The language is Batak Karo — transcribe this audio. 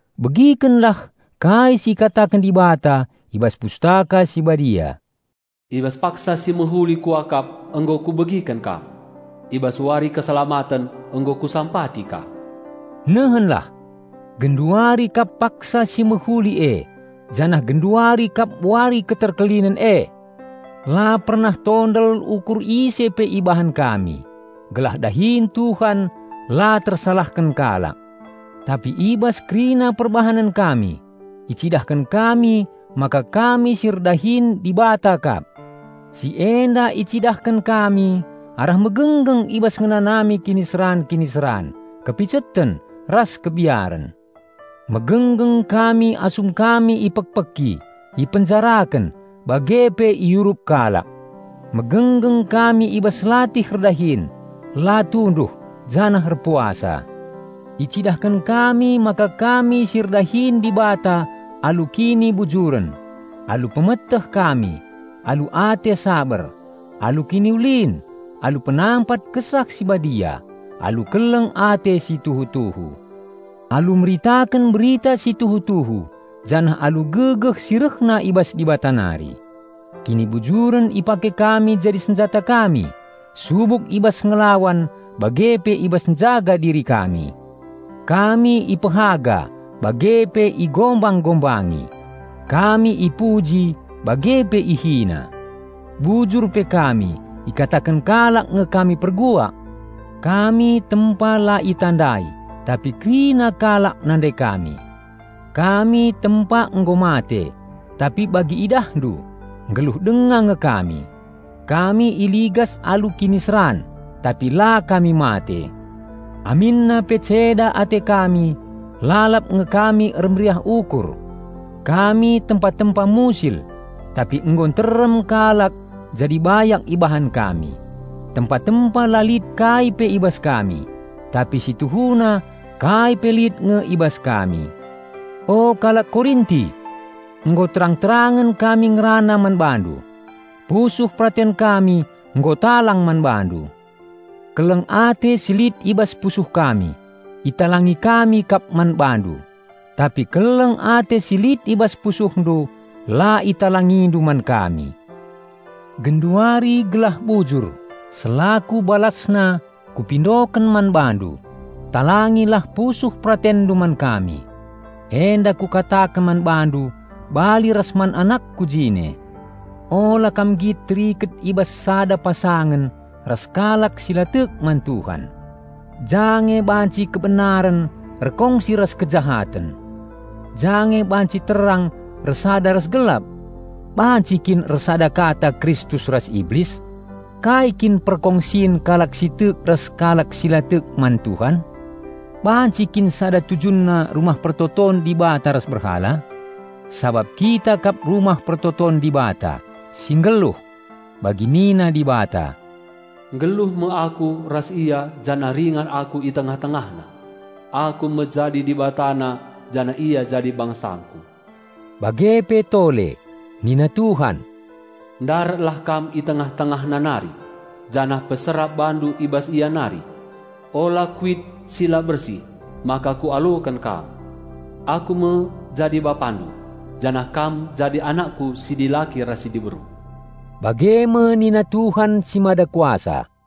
Begikenlah kai si ikataken Dibata i bas Pustaka Si Badia, "I bas paksa si mehuli Kuakap nggo Kubegiken kam. I bas wari keselamaten, nggo Kusampati kam." Nehenlah! Genduari kap paksa si mehuli e, janah genduari kap wari keterkelinen e! La pernah tondel ukur ise pe ibahan kami, gelah dahin Tuhan la tersalahken kalak. Tapi i bas kerina perbahanen kami icidahken kami maka kami si erdahin Dibata kap. Si enda icidahken kami arah megenggeng i bas ngenanami kiniseran-kiniseran, kepiceten, ras kebiaren. Megenggeng kami asum kami ipekpeki, ipenjaraken, bage pe iurup kalak. Megenggeng kami i bas latih erdahin, la tunduh, janah erpuasa. Icidahken kami maka kami si erdahin Dibata alu kinibujuren, alu pemeteh kami, alu ate saber, alu kiniulin, alu penampat Kesah Si Badia, alu keleng ate si tuhu-tuhu. Alu meritaken berita si tuhu-tuhu janah alu gegeh si rehna i bas Dibata nari. Kinibujuren ipake kami jadi senjata kami, subuk i bas ngelawan bage pe i bas njaga diri kami. Kami ipehaga bage pe igombang-gombangi; kami ipuji bage pe ihina. Bujur pe kami, ikataken kalak nge kami perbual. Kami tempa la itandai, tapi kerina kalak nandai kami. Kami tempa nggo mate, tapi bagi idahndu, nggeluh denga nge kami. Kami iligas alu kiniseran, tapi la kami mate. Aminna pe ceda ate kami, lalap nge kami ermeriah ukur. Kami tempa-tempa musil, tapi nggo nterem kalak jadi bayak ibahan kami. Tempa-tempa la lit kai pe i bas kami, tapi si tuhuna kai pe lit nge i bas kami. O kalak Korinti! Nggo terang-terangen kami ngerana man bandu. Pusuh peraten kami nggo talang man bandu. Keleng ate si lit i bas pusuh kami italangi kami kap man bandu, tapi keleng ate si lit i bas pusuhndu la italingindu man kami. Genduari gelah bujur, selaku balasna kupindoken man bandu: talangilah pusuh peratenndu man kami. Enda kukataken man bandu bali ras man anakku jine. Ula kam nggit teriket i bas sada pasangen ras kalak si la tek man Tuhan. Ja nge banci kebenaren erkongsi ras kejahaten! Ja nge banci terang ersada ras gelap! Banci kin ersadakata Kristus ras Iblis? Kai kin perkongsin kalak si tek ras kalak si la tek man Tuhan? Banci kin sada tujunna Rumah Pertoton Dibata ras berhala? Sabap kita kap Rumah Pertoton Dibata, si nggeluh. Bagi nina Dibata, "Nggeluh me aku ras ia janah ringan aku i tengah-tengahna. Aku me jadi Dibatana janah ia jadi bangsangKu." Bage pe tole, "Nina Tuhan 'Ndaratlah kam i tengah-tengahna nari, janah peserap bandu i bas ia nari. Ula kuit si la bersih, maka Kualoken kam. Aku me jadi Bapandu, janah kam jadi anakKu si dilaki ras si diberu,' bage me nina Tuhan si Mada Kuasa."